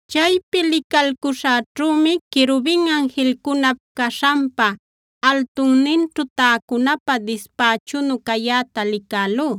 Chaypi licalcuśhäćhümi querubin anjilcunap caśhanpa altunninćhu täcunapä dispächunu cayäta licälú.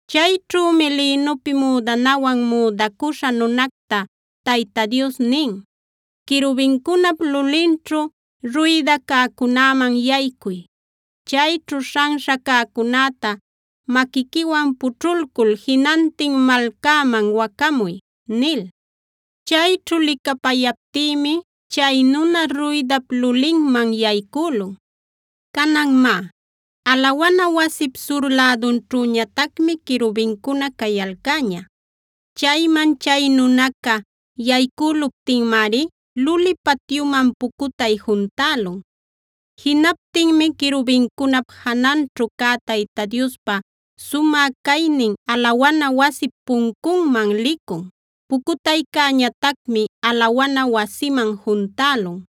Chayćhümi lïnupi müdanawan müdacuśha nunacta Tayta Dios nin: “Querubincunap lulinćhu ruyda cäcunäman yaycuy. Chayćhu śhanśha cäcunäta maquiquiwan pućhulcul jinantin malcäman wacamuy” nil.b Chayćhu licapayaptïmi chay nuna ruydap lulinman yaycülun. Canan má, alawana wasip sur lädunćhüñatacmi querubincuna cayalcäña. Chayman chay nunaca yaycüluptinmari luli patyunman pucutay juntälun. Jinaptinmi querubincunap jananćhu cä Tayta Diospa sumä caynin alawana wasip puncunman licun. Pucutaycäñatacmi alawana wasiman juntälun;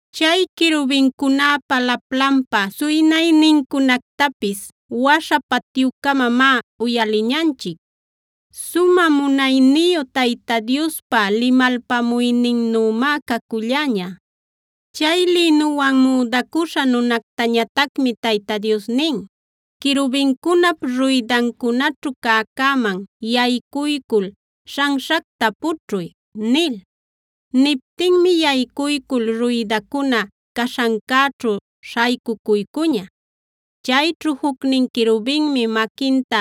Chay querubincunäpa laplanpa suynaynincunactapis waśha patyücamamá uyaliñanchic; sumä munayniyu Tayta Diospa limalpamuyninnümá caculläña. Chay lïnuwan müdacüśha nunactañatacmi Tayta Dios nin: “Querubincunap ruydancunaćhu cäcäman yaycuycul śhanśhacta pućhuy” nil. Niptinmi yaycuycul ruydacuna caśhancäćhu śhaycucuycuña. Chayćhu jucnin querubinmi maquinta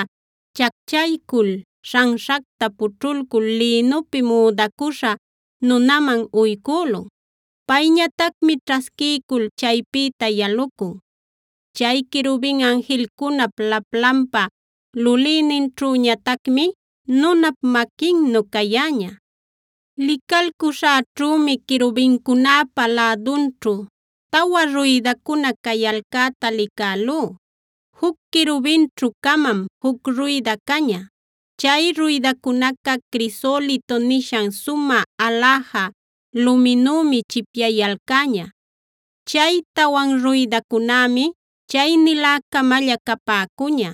chacchaycul śhanśhacta pućhulcul lïnupi müdacuśha nunaman uycülun. Payñatacmi ćhasquiycul chaypïta yalucun. Chay querubin anjilcunap laplanpa lulïninćhüñatacmi nunap maquinnu cayäña. Licalcuśhäćhümi querubincunäpa lädunćhu tawa ruydacuna cayalcäta licälú; juc querubinćhu-camam juc ruyda caña. Chay ruydacunaca crisolito nishan sumä aläja luminümi chipyayalcäña. Chay tawan ruydacunämi chay nilä-camalla capäcuña;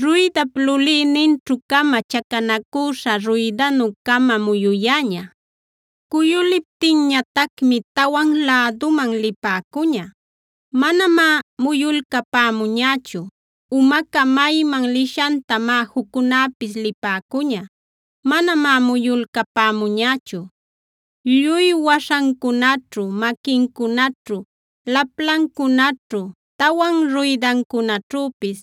ruydap lulïninćhu-camam chacanacüśha ruydanu-cama muyuyäña. Cuyuliptinñatacmi tawan läduman lipäcuña; manamá muyulcapämuñächu. Umaca mayman lishantamá juccunäpis lipäcuña; manamá muyulcapämuñächu. Lluy waśhancunaćhu, maquincunaćhu, laplancunaćhu,d tawan ruydancunaćhüpis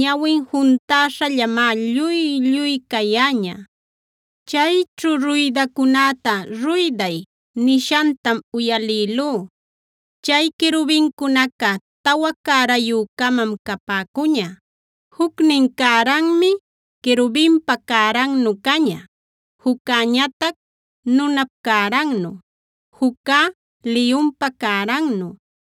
ñawip juntäśhallamá lluy-lluy cayäña. Chayćhu ruydacunäta “ruyday”e nishantam uyalïlú.f Chay querubincunaca tawa cärayü-camam capäcuña. Jucnin cäranmi querubinpa cärannug caña, juccäñatac nunap cärannu, juccä liyunpa cärannu,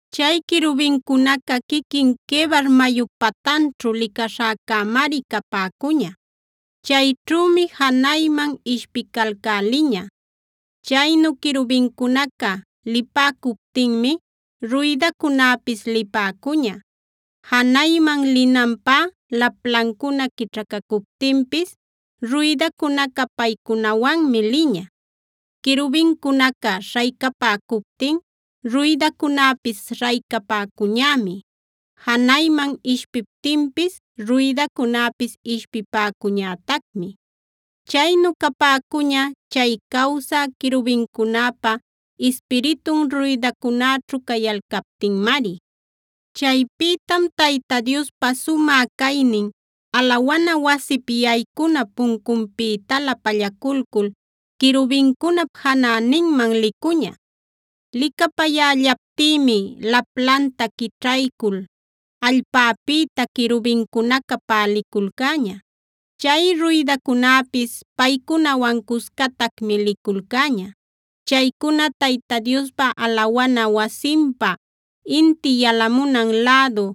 Chay querubincunaca quiquin Quebar mayup patanćhu licaśhäcämari capäcuña.i Chayćhümi janayman ishpicalcäliña. Chaynu querubincunaca lipäcuptinmi ruydacunäpis lipäcuña. Janayman linanpä laplancuna quićhacacuptinpis ruydacunaca paycunawanmi liña. Querubincunaca śhaycapäcuptin ruydacunäpis śhaycapäcuñämi. Janayman ishpiptinpis ruydacunäpis ishpipäcuñätacmi. Chaynu capäcuña chay cawsä querubincunäpa ispiritun ruydacunäćhu cayalcaptinmari. Chaypïtam Tayta Diospa sumä caynin alawana wasip yaycuna puncunpïtalä pallaculcul, querubincunap janäninman licuña. Licapayällaptïmi laplanta quićhaycul allpäpïta querubincunaca päliculcäña. Chay ruydacunäpis paycunawan cuscatacmi liculcäña. Chaycuna Tayta Diospa alawana wasinpa inti yalamunan lädu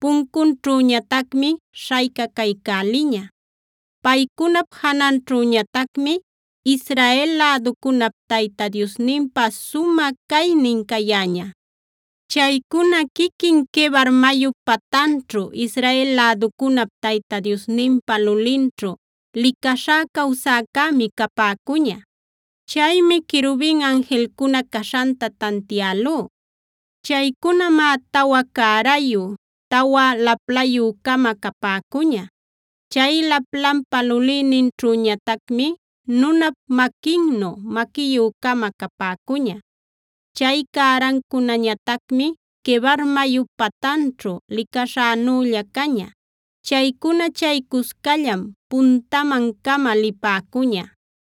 puncunćhüñatacmi śhaycacaycäliña. Paycunap jananćhüñatacmi Israel läducunap Tayta Diosninpa sumä caynin cayäña. Chaycuna quiquin Quebar mayup patanćhu Israel läducunap Tayta Diosninpa lulinćhu licaśhá cawsäcämi capäcuña. Chaymi querubin anjilcuna caśhanta tantialú. Chaycunamá tawa cärayu, tawa laplayü-cama capäcuña. Chay laplanpa lulïninćhüñatacmi nunap maquinnu maquiyü-cama capäcuña. Chay cärancunañatacmi Quebar mayup patanćhu licaśhänülla caña. Chaycuna chay cuscallam puntaman-cama lipäcuña.